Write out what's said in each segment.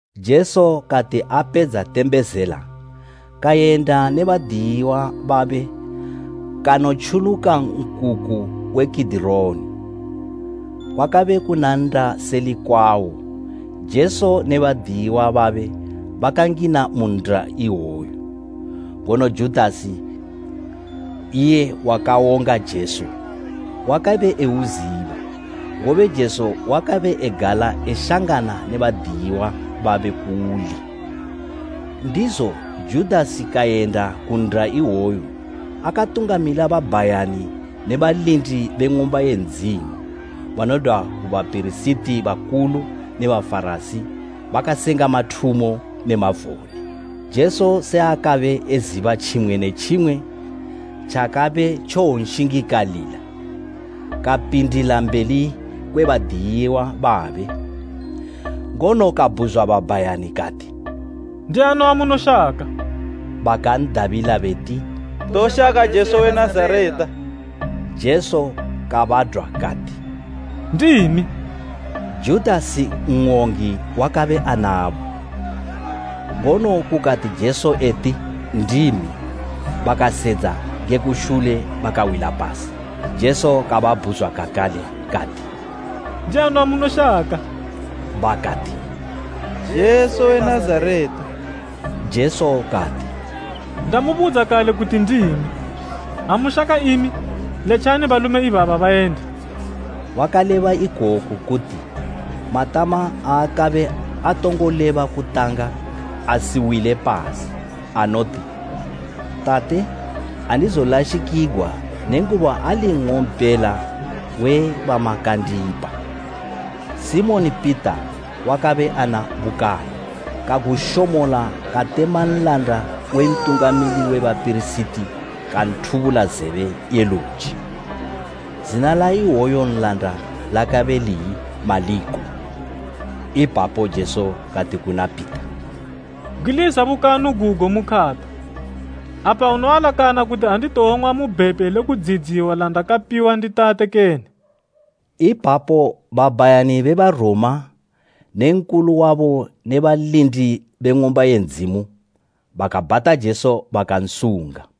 Jesu kati apedza tembezela, kayenda ne badiyiwa babe kanotjuluka nkuku we Kidironi. Kwakabe kuna nnda seli kwawo, Jesu ne badiyiwa babe bakangina mu nnda iwoyu. Ngono Judasi, iye wakawonga Jesu, wakabe euziba, ngobe Jesu wakabe egala eshangana ne badiyiwa babe kuuli. Ndizo Judasi kayenda ku nnda iwoyo akatungamila babhayani ne balindi be Ng'umba ye Ndzimu banodwa ku bapirisiti bakulu ne Bafarasi bakasenga mathumo ne mavone. Jesu se akabe eziba tjimwe ne tjimwe tjakabe tjowonshingikalila, kapindila mbeli kwe badiyiwa babe ngono kabhuzwa babhayani kati, “Ndiani wamunoshaka?” Bakan'dabila beti, “Toshaka Jesu we Nazareta.” Jesu kabadwa kati, “Ndimi.” Judasi n'wongi, wakabe anabo. Ngono kukati Jesu eti, “Ndimi” bakasedza nge kushule bakawila pasi. Jesu kababhuzwa kakale kati, “Ndiani wamunoshaka?” Bakati “Jesu we Nazareta.” Jesu kati, “Ndamubudza kale kuti ndimi. Ha mushaka imi, letjani balume ibaba bayende.” Wakaleba ikoku kuti matama aakabe atongo leba kutanga asiwile pasi, anoti; “Tate, andizolashikigwa nenguba ali nng'ompela we bamakandipa.” Simoni Pita wakabe ana bukanu, kagushomola katema nlanda we Ntungamili we bapirisiti kanthubula zebe ye luji. Zina la iwoyo nlanda lakabe liyi Maliko. Ipapo Jesu kati kuna Pita, “Bgwiliza bukanu gugo mu khata. Apa unoalakana kuti anditowong'wa mu bhepe le kudziyidziwa landakapiwa ndi Tate kene?” Ipapo babhayani be Baroma ne Nkulu wabo ne balindi be Ng'umba ye Ndzimu bakabhata Jesu, bakansunga.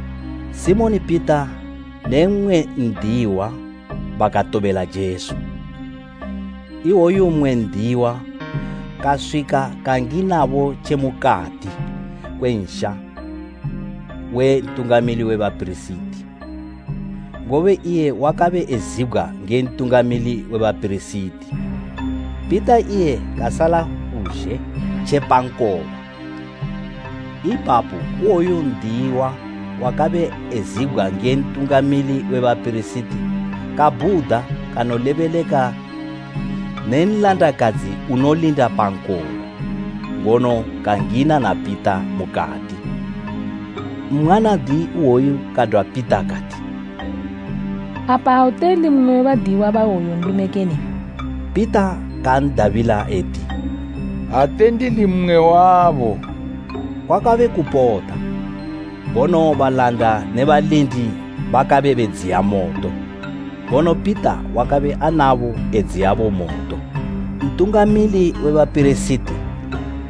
Simoni Pita ne mmwe n'diyiwa bakatobela Jesu. Iwoyo mmwe n'diyiwa kaswika kanginabo tje mukati kwe nsha we Ntungamili we bapirisiti, ngobe iye wakabe ezibgwa nge Ntungamili we bapirisiti. Pita iye kasala kuzhe tje pa nkoba. Ipapo iwoyo n'diyiwa wakabe ezibgwa nge Ntungamili we bapirisiti kabhuda kanolebeleka ne nlandakadzi unolinda pa nkoba, ngono kangina na Pita mukati. Mwanadi iwoyu kadwa Pita kati, “Apa ate uli mmwe we badiyiwa ba iwoyu nlume kene?” Pita kan'dabila eti, “Ate ndili mmwe wabo.” Kwakabe kupota, ngono balanda ne balindi bakabe bedziya moto, ngono Pita wakabe anabo edziyabo moto. Ntungamili we bapirisiti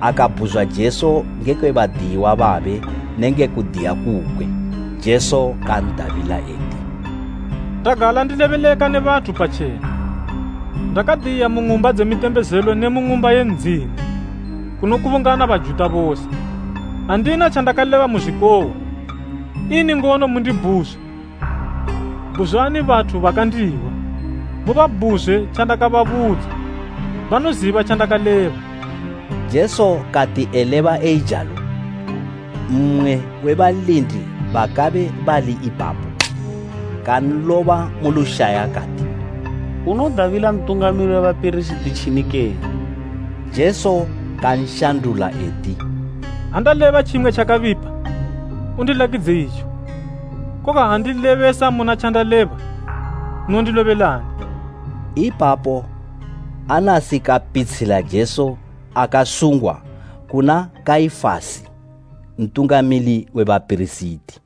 akabhuzwa Jesu ngekwe badiyiwa babe ne nge kudiya kukwe. Jesu kan'dabila eti, “Ndagala ndilebeleka ne bathu patjena, ndakadiya mu ng'umba dze mitembezelo ne mu Ng'umba ye Ndzimu, kunokubungana Bajuta bose. Andina tjandakaleba muzwikohwa. Ini ngono mundibhuzwa? Bhuzwani bathu bakandihwa. Mubabhuzwe tjandakababudza, banoziba tjandakaleba.” Jesu kati eleba eijalo mmwe we balindi bakabe bali ipapo kanloba mu lushaya kati, “Unodabila Ntungamili we bapirisiti tjini kene!” Jesu kanshandula eti, “Ha ndaleba tjimwe tjakabipa, undilakidze itjo. Koga ha ndilebesa muna tjandaleba, unondilobelani?” Ipapo Anasi kapitshila Jesu akasungwa kuna Kaifasi Ntungamili we bapirisiti.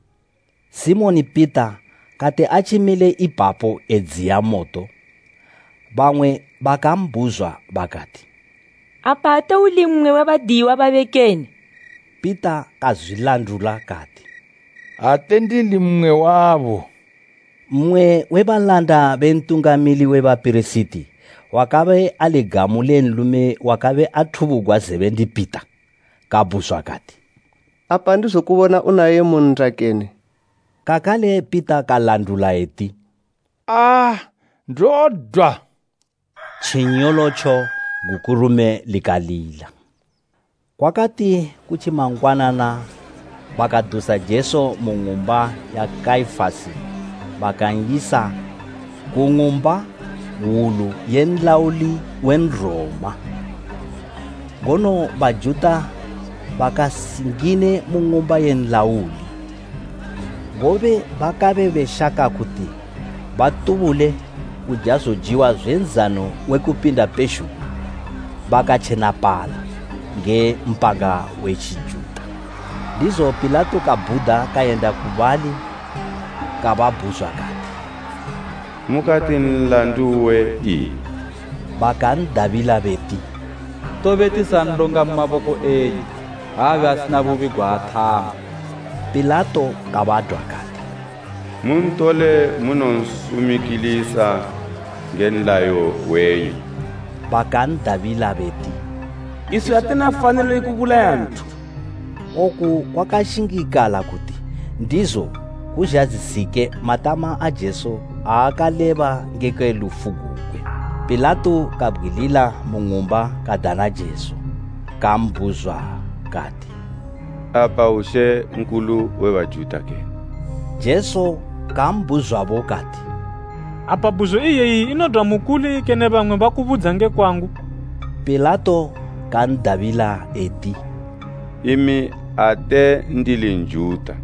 Simoni Pita kati atjimile ipapo edziya moto, bamwe bakambhuzwa bakati, “Apa ate uli mmwe we badiyiwa babe kene?” Pita kazwilandula kati, “Ate ndili mmwe wabo.” Mmwe we balanda be Ntungamili we bapirisiti, wakabe ali gamu le nlume wakabe athubugwa zebe ndi Pita, kabhuzwa kati, “Apa andizokubona unaye mu nnda kene?” Kakale Pita kalandula eti, “Aa, ndodwa!” Tjinyolotjo gukurume likalila. Kwakati ku tjimangwanana bakadusa Jesu mu ng'umba ya Kaifasi bakan'yisa ku ng'umba hwulu ye nlauli we Nroma. Ngono Bajuta bakasingine mu ng'umba ye nlauli, ngobe bakabe beshaka kuti batubule kuja zojiwa zwe Nzano we Kupinda pezhugwi bakatjenapala, nge mpanga we Tjijuta. Ndizo Pilato kabhuda kayenda ku bali kababhuzwa kati, “Mukati nlandu uwe ini?” Bakan'dabila beti, “Tobe tisanlonga mu maboko enyu, ha abe asina bubi gwaathama.” Pilato kabadwa kati, “Muntole munonsumikilisa nge nlayo wenyu.” Bakan'dabila beti, “Iswi atina fanilo ye kubulaya nthu.” Oku kwakashingikala kuti ndizo kuzhadzisike matama a Jesu aakaleba ngekwe lufu gugwe. Pilato kabgwilila mu ng'umba kadana Jesu. Kambhuzwa kati, “Apa u Mambo we Bajuta kene?” Jesu kambhuzwabo kati, “Apa bhuzo iyeyi inodwa mukuli kene bamwe bakubudza nge kwangu?” Pilato kan'dabila eti, “Imi ate ndili Njuta.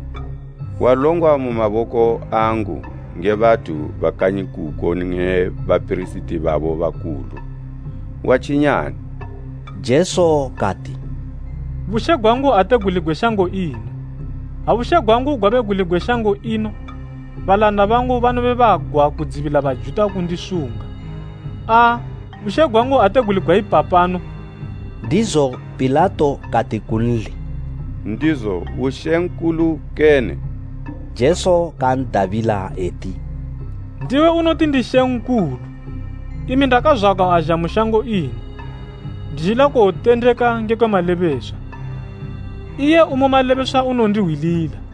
Walongwa mu maboko angu nge bathu ba kanyi kuko ne bapirisiti babo bakulu. Watjinyani?” Jesu kati, “Bushe gwangu ate guli gwe shango ino, ha bushe gwangu gwabe guli gwe shango ino, balanda bangu banobe bagwa kudzibila Bajuta kundisunga. Aa, bushe gwangu ate guli gwaipapano!” Ndizo Pilato kati kunli, “Ndizo u mambo kene?” Jesu kan'dabila eti, “Ndiwe unoti ndi mambo. Imi ndakazwagwa azha mu shango ino, ndizhila kuwotendeka ngekwe malebeswa. Iye umu malebeswa unondihwilila.”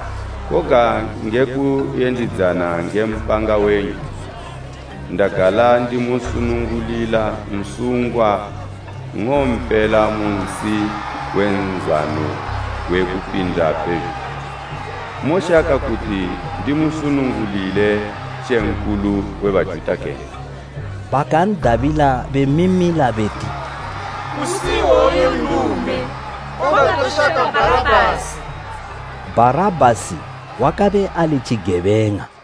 Koga nge kuyendidzana nge mpanga wenyu, ndagala ndimusunungulila nsungwa nng'ompela mu nsi we Nzano we Kupinda pezhugwi. Moshaka kuti ndimusunungulile Mambo we Bajuta kene?” Bakan'dabila bemimila beti, “Kusi iwoyu nlume! Koga toshaka Bharabhasi!” Bharabhasi wakabe ali tjigebeng'a.